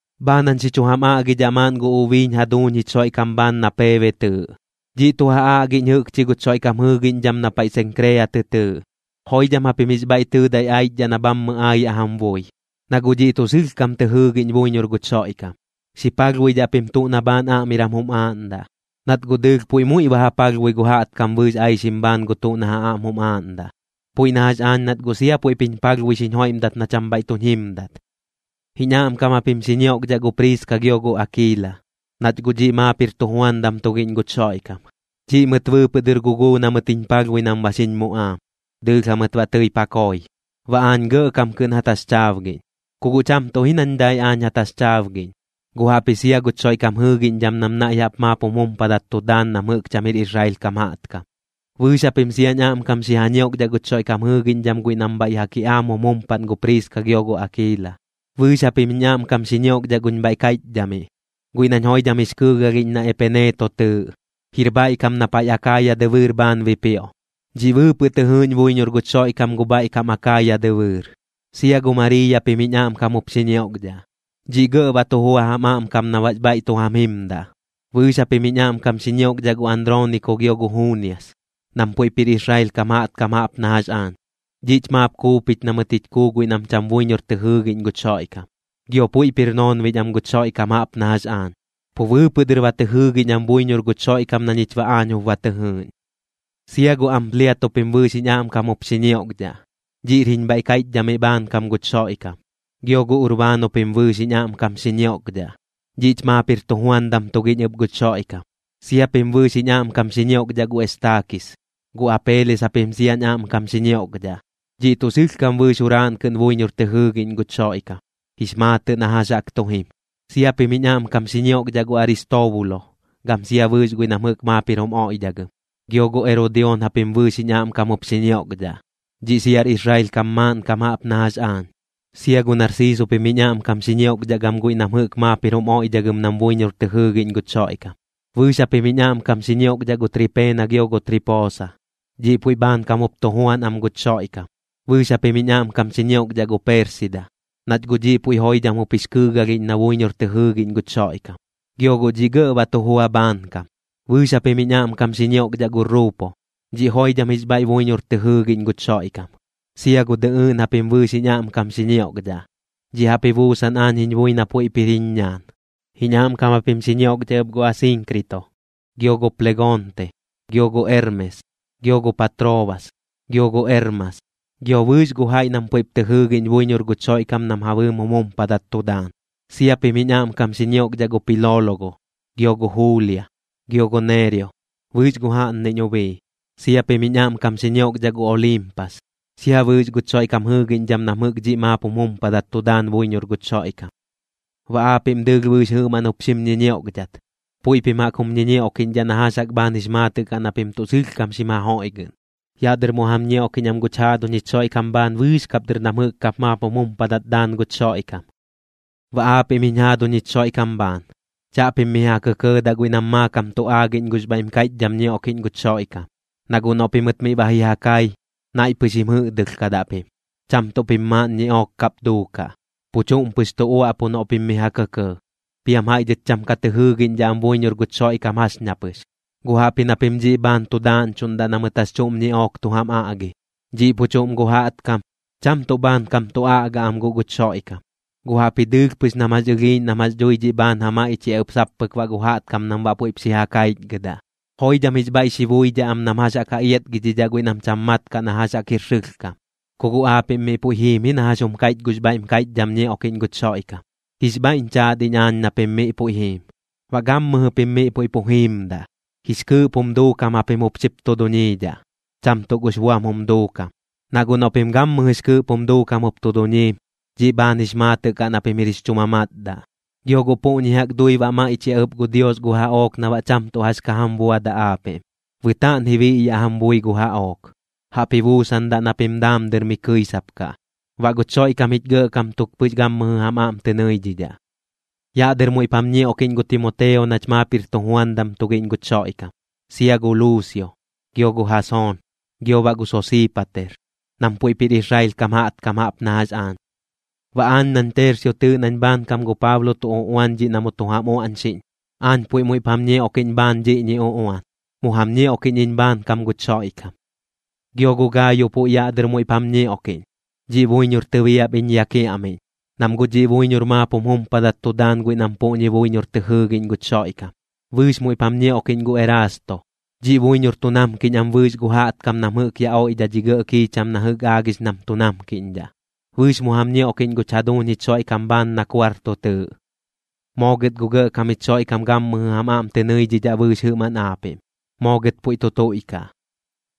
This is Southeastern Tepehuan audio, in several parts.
Bhaan jañ xi chu jam aꞌgidhaꞌ maaꞌn gu ubiiñ jaduuñ jich Xoiꞌkam bhaan na Peebe tɨɨꞌ. Dhiꞌ tu ja aꞌgiꞌñ jɨꞌkchi guch Xoiꞌkam jɨɨgiꞌñdham na paiꞌ Senkrea tɨ tɨɨꞌ. Joidham japim jix bhaiꞌ tɨɨdai aichdhaꞌ na bhammɨ aayaꞌ jam bui, na guꞌ dhiꞌ tuꞌ sɨlhkam tɨ jɨɨgiꞌñ buiñor guch Xoiꞌkam. Xi palhbuidhaꞌ pim tuꞌ na bhaan aꞌmiram jum aaꞌndaꞌ, nat guꞌ dɨɨlh puiꞌ muiꞌ ba ja palhbui gu jaꞌtkam bɨɨx aixim bhaan gu tuꞌ na ja aꞌm jum aaꞌndaꞌ, puiꞌ na jax aañ nat guꞌ sia puiꞌp jiñ palhbui xiñ joiꞌmdak na cham bhaiꞌ tuñ jimdat. Jiñ aꞌmkam japim xi ñioꞌkdhaꞌ gu Priiska gio gu Akiila, nach guꞌ dhiꞌ maap jir tujuandam tugiꞌñ guch Xoiꞌkam. Dhiꞌ mɨt bɨɨpɨꞌ dɨr guguu na mɨt jiñ palhbui nam ba xiñ muꞌaam, dɨɨlh jamɨt baꞌ tɨip ja koi. Baꞌ aañ gɇꞌkam kɨꞌn ja taxchaabgiꞌñ, ku guꞌ cham tuꞌ ji nañ dai aañ ja taxchaabgiꞌñ, guꞌ jaꞌpji sia guch Xoiꞌkam jɨɨgiꞌñdham nam naiꞌ jaꞌp maap jum jumpadat tu daan nam jɨꞌk cham jir Israel kam jaꞌtkam. Bɨɨx japim siañ aꞌmkam xi ja ñioꞌkdhaꞌ guch Xoiꞌkam jɨɨgiꞌñdham guiꞌ nam bhaiꞌ ja kiꞌaam jum jumpaꞌn gu Priiska gio gu Akiila. Bɨɨx japim jiñ aꞌmkam xi ñioꞌkdhaꞌ guñ bhaiꞌ kaiꞌchdhamiꞌ, guiꞌ nañ joidham jix kɨɨgalhiꞌñ na Epeneeto tɨɨꞌ. Jir bhaiꞌ kam na paiꞌ Akaaya dɨbɨɨr bhaan bipioꞌ, dhiꞌ bɨɨpɨꞌ tɨ jɨɨꞌñ buiñor guch Xoiꞌkam gu bhaiꞌ kam Akaaya dɨbɨɨr. Sia gu Mariiya pim jiñ aꞌmkam jup xi ñioꞌkdhaꞌ. Dhiꞌ gɇꞌ ba tu jua jam aꞌmkam na baꞌx bhaiꞌ tu jam jimdaꞌ. Bɨɨx japim jiñ aꞌmkam xi ñioꞌkdhaꞌ gu Androoniko gio gu Juunias, nam puiꞌp jir Israel kam jaꞌtkam jaꞌp na jax aañ. Dhiꞌch maap kuupich na mɨt jich kuu guiꞌ nam cham buiñor tɨ jɨɨgiꞌñ guch Xoiꞌkam, gio puiꞌp jir noonbiꞌñ am guch Xoiꞌkam jaꞌp na jax aañ, pu bɨɨpɨꞌ dɨr ba tɨ jɨɨgiꞌñ am buiñor guch Xoiꞌkam na ñich baꞌ aañ jup ba tɨ jɨɨꞌñ. Sia gu Ampliato pim bɨɨx jiñ aꞌmkam jup xi ñioꞌkdhaꞌ. Dhiꞌr jiñ bhaiꞌ kaiꞌchamiꞌ bhaankam guch Xoiꞌkam. Gio gu Urbaano pim bɨɨx jiñ aꞌmkam xi ñioꞌkdhaꞌ. Dhiꞌch maap jir tujuandam tugiꞌñ ɨp guch Xoiꞌkam. Sia pim bɨɨx jiñ aꞌmkam xi ñioꞌkdhaꞌ gu Estaakis. Gu Apeeles japim siañ aꞌmkam xi ñioꞌkdhaꞌ. Dhiꞌ tuꞌ sɨlhkam bɨɨx juraaꞌn kɨꞌn buiñor tɨ jɨɨgiꞌñ guch Xoiꞌkam, jix maatɨꞌ na jax jaꞌk tu jim. Sia pim jiñ aꞌmkam xi ñioꞌkdhaꞌ gu Aristoobulo, gam sia bɨɨx guiꞌ nam jɨꞌk maap jir jum oiꞌdhagɨm. Gio gu Erodioon japim bɨɨx jiñ aꞌmkam jup xi ñioꞌkdhaꞌ. Dhiꞌ siar Israel kam maaꞌnkam jaꞌp na jax aañ. Sia gu Narsiiso pim jiñ aꞌmkam xi ñioꞌkdhaꞌ gam guiꞌ nam jɨꞌk maap jir jum oiꞌdhagɨm nam buiñor tɨ jɨɨgiꞌñ guch Xoiꞌkam. Bɨɨx japim jiñ aꞌmkam xi ñioꞌkdhaꞌ gu Tripeena gio tu Tripoosa. Dhiꞌ puiꞌ bhaankam jup tu juan am guch Xoiꞌkam. Bɨɨx japim jiñ aꞌmkam xi ñioꞌkdhaꞌ gu Peersida, nach guꞌ dhiꞌ puiꞌ joidham jup jix kɨɨgalhiꞌñ na buiñor tɨ jɨɨgiꞌñ guch Xoiꞌkam, gio guꞌ dhiꞌ gɇꞌ ba tu jua bhaankam. Bɨɨx japim jiñ aꞌmkam xi ñioꞌkdhaꞌ gu Ruupo. Dhiꞌ joidham jix bhaiꞌ buiñor tɨ jɨɨgiꞌñ guch Xoiꞌkam. Sia gu dɨꞌɨɨꞌn japim bɨɨx jiñ aꞌmkam xi ñioꞌkdhaꞌ. Dhiꞌ jaꞌp ji buusan aañ jiñ bui na puiꞌp jir jiñ ñaan. Jiñ aꞌmkam japim xi ñioꞌkdhaꞌ ɨp gu Asiinkrito, gio gu Plegonte, gio gu Ermes, gio gu Patroobas, gio gu Ermas, gio bɨɨx gu jaiꞌ nam puiꞌp tɨ jɨɨgiꞌñ buiñor guch Xoiꞌkam nam ja bɨɨm jum jumpadat tu daan. Sia pim jiñ aꞌmkam xi ñioꞌkdhaꞌ gu Piloologo, gio gu Juulia, gio gu Neereo, bɨɨx gu jaꞌnniꞌñ ubii. Sia pim jiñ aꞌmkam xi ñioꞌkdhaꞌ gu Oliimpas, sia bɨɨx guch Xoiꞌkam jɨɨgiꞌñdham nam jɨꞌk dhiꞌ maap jum jumpadat tu daan buiñor guch Xoiꞌkam. Baꞌ aapiꞌm dɨɨlh bɨɨx jɨꞌmaꞌn jup xim ñiñioꞌkdhat. Puiꞌ pim jaꞌk jum ñiñioꞌkiꞌñdhaꞌ na jax jaꞌk bhaan jix maatɨꞌ kaꞌ na pim tuꞌ sɨlhkam xim ja joiꞌgɨꞌn. Yaꞌ dɨr mu jam ñioꞌkiꞌñ am guch jaaduñ jich Xoiꞌkam bhaan bɨɨx kap dɨr nam jɨꞌk kap maap jum jumpadat daan guch Xoiꞌkam. Baꞌ aapiꞌm jiñ jaaduñ jich Xoiꞌkam bhaan, chaꞌpim mi ja kɇkɇɇdaꞌ guiꞌ nam maakam tu aagiꞌñ gux bhaiꞌm kaiꞌchdham ñioꞌkiꞌñ guch Xoiꞌkam. Na guꞌ noꞌ pimɨt miꞌ ba ji ja kai, naiꞌ pɨx jim jɨꞌdɨlhkadaꞌ pim, cham tuꞌ pim maaꞌn ñiꞌook kap duukaꞌ, pu chuꞌm pɨx tu uaꞌpu noꞌ pim mi ja kɇkɇɇ. Piam jaiꞌ dhɨt cham ka tɨ jɨɨgiꞌñdhaꞌ am buiñor guch Xoiꞌkam jax ña pɨx. Guꞌ jaꞌpji na pim dhiꞌ bhaan tu daaꞌñchuꞌndaꞌ na mɨt jax chuꞌm ñiꞌook tu jam aꞌgi. Dhiꞌ pu chuꞌm gu jaꞌtkam, cham tuꞌ bhaankam tu aꞌga am guꞌ guch Xoiꞌkam, guꞌ jaꞌpji dɨɨlh pɨx nam jax ɨlhiiꞌñ nam jax dhui dhiꞌ bhaan ja maiꞌchiaꞌ ɨp sap pɨk baꞌ gu jaꞌtkam nam baꞌ puiꞌp xi ja kaichgɨdaꞌ. Joidham jix bhaiꞌ xi buidhaꞌ am nam jax jaꞌk ja iatgidhidhaꞌ guiꞌ nam cham mat kaꞌ na jax jaꞌk jir sɨlhkam. Ku guꞌ aapiꞌm miꞌ puiꞌ jiim ji na jax jum kaiꞌch gux bhaiꞌm kaiꞌchdham ñioꞌkiꞌñ guch Xoiꞌkam. Jix bhaiꞌñ chaat iñ aañ na pim miꞌ puiꞌ jiim. Baꞌ gammɨjɨ pim miꞌ puiꞌ pu jiimdaꞌ, jix kɨɨꞌp jum duukam japim jup xip tu duñiidhaꞌ, cham tuꞌ gux buam jum duukam. Na guꞌ noꞌ pim gammɨjɨx kɨɨꞌp jum duukam jup tu duñiim, dhiꞌ bhaan jix maatɨꞌ kaꞌ na pim jir jix chu mamatdaꞌ. Gio guꞌ puꞌñi jaꞌk dui baꞌ maiꞌchiaꞌ ɨp gu Dios gu jaꞌook na baꞌ cham tuꞌ jax ka jam buadaꞌ aapiꞌm. Bɨtaaꞌn ji biꞌyaꞌ jam bui gu jaꞌook, jaꞌp ji buusandaꞌ na pim daam dɨr mi kɨisapkaꞌ. Baꞌ guch Xoiꞌkam jich Gɇꞌkam tuk pɨx gammɨjɨ jam aꞌm tɨ nɨidhidhaꞌ. Yaꞌ dɨr muiꞌp jam ñioꞌkiꞌñ gu Timoteo nach maap jir tujuandam tugiꞌñ guch Xoiꞌkam. Sia gu Luusio, gio gu Jasoon, gio baꞌ gu Sosiipater, nam puiꞌp jir Israel kam jaꞌtkam jaꞌp na jax aañ. Baꞌ aañ nañ Tersio tɨɨꞌ nañ bhaankam gu Paablo tu uꞌuan dhiꞌ na mu tu jam uaꞌñxiꞌñ, aañ puiꞌ muiꞌp jam ñioꞌkiꞌñ bhaan dhiꞌñi uꞌuan, mu jam ñioꞌkiꞌñ iñ bhaankam guch Xoiꞌkam. Gio gu Gaayo puiꞌ yaꞌ dɨr muiꞌp jam ñioꞌkiꞌñ. Dhiꞌ buiñor tɨbiap iñ ya kiaꞌmiꞌñ, nam guꞌ dhiꞌ buiñor maap jum jumpadat tu daan guiꞌ nam puꞌñi buiñor tɨ jɨɨgiꞌñ guch Xoiꞌkam. Bɨɨx muiꞌp jam ñioꞌkiꞌñ gu Erasto. Dhiꞌ buiñor tu namkiꞌñ am bɨɨx gu jaꞌtkam nam jɨꞌk yaꞌ oidhaꞌ dhi gɇꞌ kiicham na jɨꞌk aagix nam tu namkiꞌñdhaꞌ. Bɨɨx mu jam ñioꞌkiꞌñ guch jaduuñ jich Xoiꞌkam bhaan na Kuarto tɨɨꞌ. Moo gɨt gu Gɇꞌkam jich Xoiꞌkam gammɨjɨ jam aꞌm tɨ nɨidhidhaꞌ bɨɨx jɨꞌmaꞌn aapiꞌm. Moo gɨt puiꞌ tu tuiꞌkaꞌ.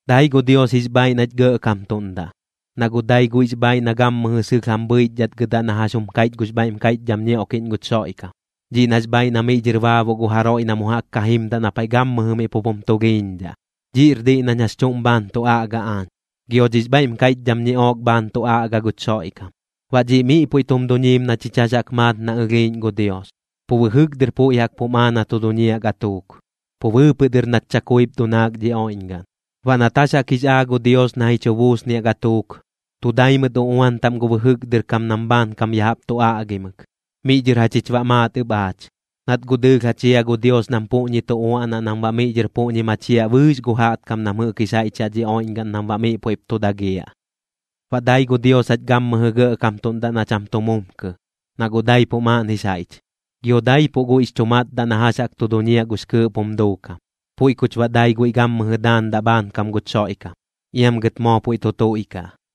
Dai gu Dios jix bhaaiꞌ nach gɇꞌkamtuꞌndaꞌ, na guꞌ dai guiꞌx bhaaiꞌ na gammɨjɨ sɨlh jam bhɨichdhatgɨdaꞌ na jax jum kaiꞌch gux bhaiꞌm kaiꞌchdham ñioꞌkiꞌñ guch Xoiꞌkam, dhiꞌ nax bhaaiꞌ na miꞌ dhɨr baabuꞌ gu jaroiꞌ na mu jaꞌk ka jimdaꞌ na paiꞌ gammɨjɨ miꞌ pup jum tulhiiñdhaꞌ. Dhiꞌr diꞌ nañ jax chuꞌm bhaan tu aꞌga aañ, gio dhix bhaiꞌm kaiꞌchdham ñiꞌook bhaan tu aꞌga guch Xoiꞌkam. Baꞌ dhiꞌ miꞌ puiꞌ tum duñiim na chich jax jaꞌk maat na ɨlhiiꞌñ gu Dios, pu bɨjɨk dɨr puiꞌ jaꞌk pum aa na tu duñiaꞌ gatuuk, pu bɨɨpɨꞌ dɨr nat chakuip dunaak dhi oiꞌñgaꞌn. Baꞌ nat jax jaꞌk jix aa gu Dios na ji chu buusniaꞌ gatuuk, tu dai mɨt uꞌuan taꞌm gu bɨjɨk dɨr kam nam bhaankam ya jaꞌp tu aꞌgimɨk. Miꞌ dhɨr jachich baꞌ maat ɨp aach, nat guꞌ dɨɨlh ja chia gu Dios nam puꞌñi tu uaꞌnaꞌ nam baꞌ miꞌ dhɨr puꞌñi machiaꞌ bɨɨx gu jaꞌtkam nam jɨꞌk jix jaiꞌch yaꞌ dhi oiꞌñgaꞌn nam baꞌ miꞌ puiꞌp tu dagiaꞌ. Baꞌ dai gu Dios jach gammɨjɨ gɇꞌkamtuꞌndaꞌ na cham tu mumkɨ, na guꞌ daipuꞌ maaꞌn jix jaiꞌch, gio daipuꞌ guiꞌx chu matdaꞌ na jax jaꞌk tu duñiaꞌ gux kɨɨꞌp jum duukam. Puiꞌ kuch baꞌ dai guiꞌ gammɨjɨ daandaꞌ bhaankam guch Xoiꞌkam. Iam gɨt moo puiꞌ tu tuiꞌkaꞌ.